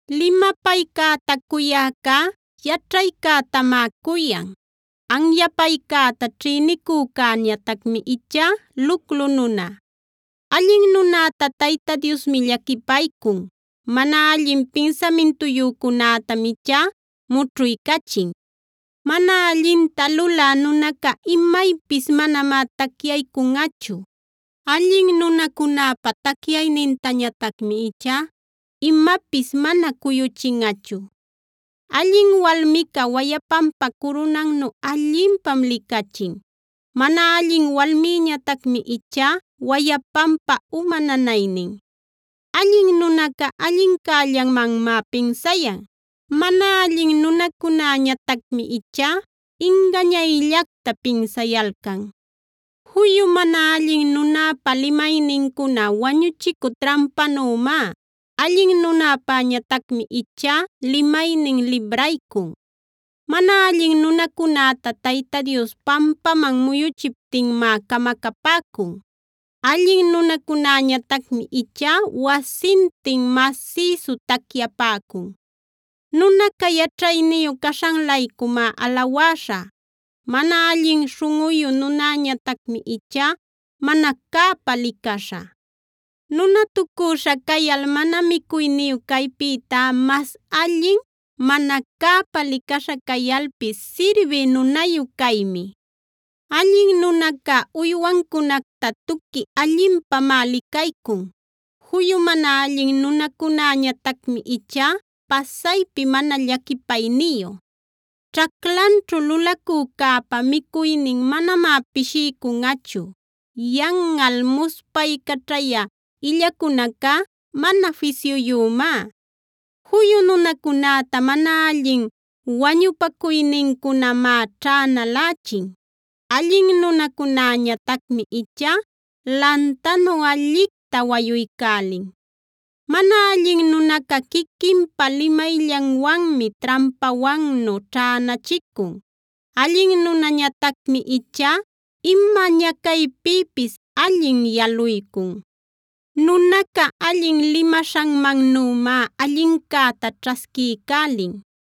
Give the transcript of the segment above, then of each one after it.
Limapaycäta cuyäcá yaćhaycätamá cuyan; anyapaycäta ćhïnicücäñatacmi ichá luclu nuna. Allin nunäta Tayta Diosmi llaquipaycun; mana allin pinsamintuyücunätam ichá mućhuycachin. Mana allinta lulä nunaca imaypis manamá tacyaycunꞌachu; allin nunacunäpa tacyaynintañatacmi ichá imapis mana cuyuchinꞌachu. Allin walmica wayapanpä curunannu allinpam licachin; mana allin walmïñatacmi ichá wayapanpa uma nanaynin. Allin nunaca allincällamanmá pinsayan; mana allin nunacunäñatacmi ichá ingañayllacta pinsayalcan. Juyu mana allin nunäpa limaynincuna wañuchicü trampanümá; allin nunäpañatacmi ichá limaynin libraycun. Mana allin nunacunäta Tayta Dios pampaman muyuchiptinmá camacapäcun; allin nunacunäñatacmi ichá wasintin masïsu tacyapäcun. Nunaca yaćhayniyu caśhan-laycumá alawäśha; mana allin śhunꞌuyu nunäñatacmi ichá mana cäpa licaśha. Nunatucüśha cayal mana micuyniyu caypïtá, mas allin, mana cäpa licaśha cayalpis sirbï nunayu caymi. Allin nunaca uywancunacta tuqui allinpamá licaycun; juyu mana allin nunacunäñatacmi ichá pasaypi mana llaquipayniyu. Ćhaclanćhu lulacücäpá micuynin manamá pishiycunꞌachu; yanꞌal muspaycaćhayä illacunacá mana fisyuyümá. Juyu nunacunäta mana allin wañupacuynincunamá ćhänalächin; allin nunacunäñatacmi ichá lantanu allicta wayuycälin. Mana allin nunaca quiquinpa limayllanwanmi trampawannu ćhänachicun; allin nunäñatacmi ichá ima ñacaypïpis allin yaluycun. Nunaca allin limaśhanmannümá allincäta ćhasquiycälin;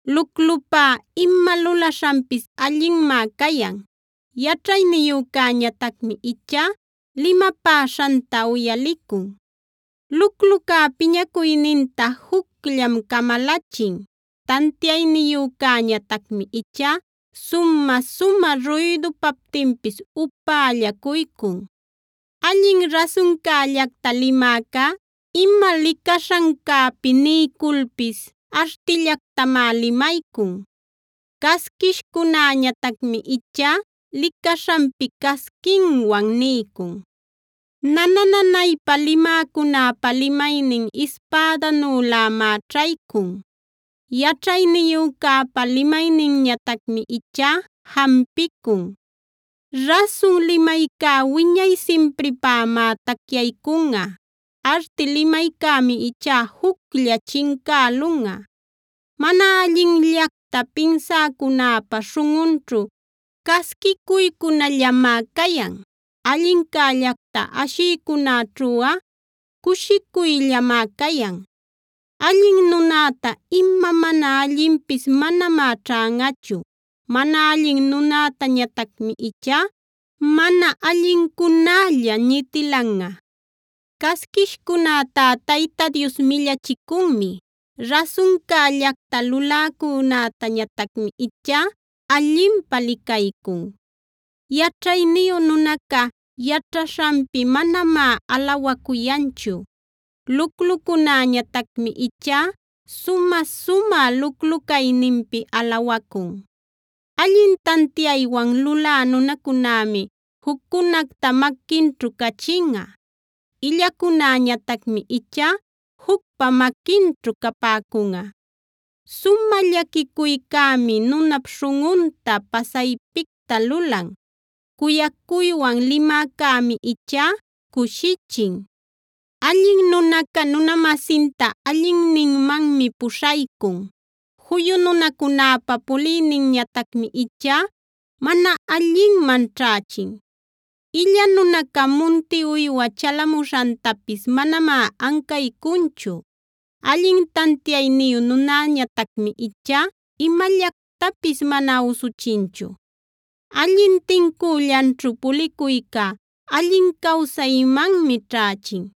Luclüpá ima lulaśhanpis allinmá cayan; yaćhayniyücäñatacmi ichá limapäśhanta uyalicun. Luclucá piñacuyninta jucllam camalachin; tantiayniyücäñatacmi ichá sumä-sumä ruydupaptinpis upällacuycun. Allin rasuncällacta limäcá ima licaśhancäpi niyculpis artillactamá limaycun; casquishcunäñatacmi ichá licaśhanpi casquinwan niycun. Nana-nanaypa limäcunäpa limaynin ispädanülämá ćhaycun; yaćhayniyücäpa limayninñatacmi ichá jampicun. Rasun limaycá wiñay-simpripämá tacyaycunꞌa; arti limaycämi ichá juclla chincälunꞌa. Mana allinllacta pinsäcunäpa śhunꞌunćhu casquicuycunallamá cayan; allincällacta ashiycunäćhuꞌa cushicuyllamá cayan. Allin nunäta ima mana allinpis manamá ćhanꞌachu; mana allin nunätañatacmi ichá mana allincunälla ñitilanꞌa. Casquishcunätá Tayta Dios millachicunmi; rasuncällacta luläcunätañatacmi ichá allinpä licaycun. Yaćhayniyu nunaca yaćhaśhanpi manamá alawacuyanchu; luclucunäñatacmi ichá sumä-sumä luclucayninpi alawacun. Allin tantiaywan lulä nunacunämi juccunacta maquinćhu cachinꞌa; illacunäñatacmi ichá jucpa maquinćhu capäcunꞌa. Sumä llaquicuycämi nunap śhunꞌunta pasaypicta lulan; cuyacuywan limäcämi ichá cushichin. Allin nunaca nuna-masinta allinninmanmi puśhaycun; juyu nunacunäpa puliyninñatacmi ichá mana allinman ćhächin. Illa nunaca munti uywa chalamuśhallantapis manamá ancaycunchu; allin tantiayniyu nunäñatacmi ichá imallactapis mana usuchinchu. Allin tincüllanćhu puliycuyca allin cawsaymanmi ćhächin;